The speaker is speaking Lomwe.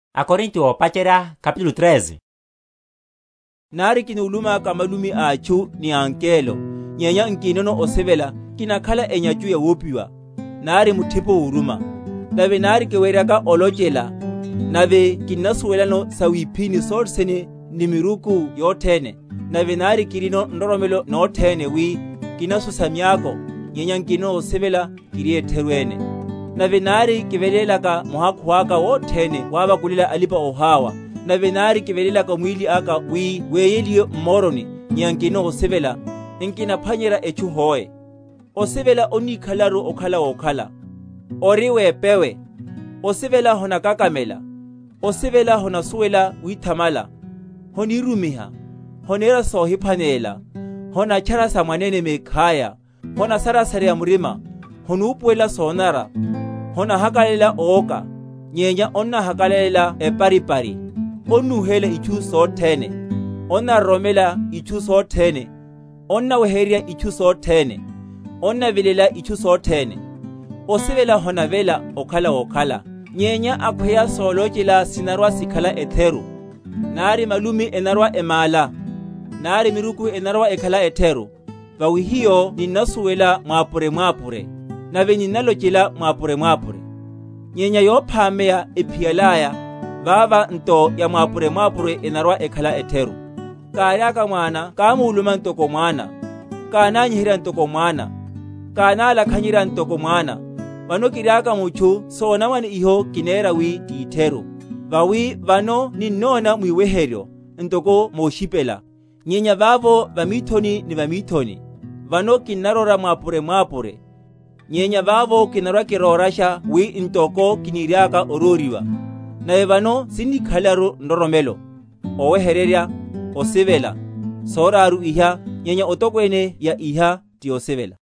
Opwaha waya wa Osivela. Nari kúlumaka malumi a atchu, ni ángelo, nyenya nkinono osivela, kinakhala enyachu yawopiwa, nari muthipo woruma. Nave nari kiweryaka olochela, nave kinasuwelano sawiphíni sothene, ni miruku yothene, nave nari kirino nroromelo nothene, wi kinasusa miako, nyenya nkinono osivela, kiri etheru ene. Nave nari kivelélaka muhakhu aka wothene wavakulela alipa‐oháwa, nave nari kivelélaka mwíli aka wi weyeliwe m’moroni, nyenya nkinono osivela, nkinaphwanyerya etchu hoe. Osivela onnikhalelaru okhala wokhala, ori wepewe; osivela honakakamela; osivela honasuwela withamala, honirumiha, honera sohiphwanelela, honatchara sa mwanene mekhaya, honasarasareya murima, honupuwelela sonanara; honahakalalela owoka, nyenya onnahakalalela eparipari; onnúhela itchu sothene, onnaroromela itchu sothene, onnaweheryerya itchu sothene, onnavilela itchu sothene. Osivela honavela okhala wokhala, nyenya akhweya solochela sinarwa‐sikhala etheru, nari malumi enarwa‐emála, nari miruku enarwa‐ekhala etheru. Vawi hiyo ninnasuwela mwápure‐mwápure, nave ninnalochela mwápure‐mwápure. Nyenya yophámeya ephiyalaya, vava nto ya mwápure‐mwápure enarwa‐ekhala etheru. Káriaka mwana kámuluma ntoko mwana, kánányiherya ntoko mwana, kánálakhanyerya ntoko mwana; vano kiriaka mutchu sonamwane iho kinera wi ti etheru. Vawi vano ninnona mwiweheryo, ntoko moshiphela; nyenya vavo va mithoni ni va mithoni. Vano kinnaróra mwápure‐mwápure; nyenya vavo kinarwa‐kirórasha wi ntoko kiniriaka oróriwa. Nave vano sinnikhalelaru nroromelo, oweheryerya, osivela, soraru iha; nyenya etokwene ya iha ti osivela.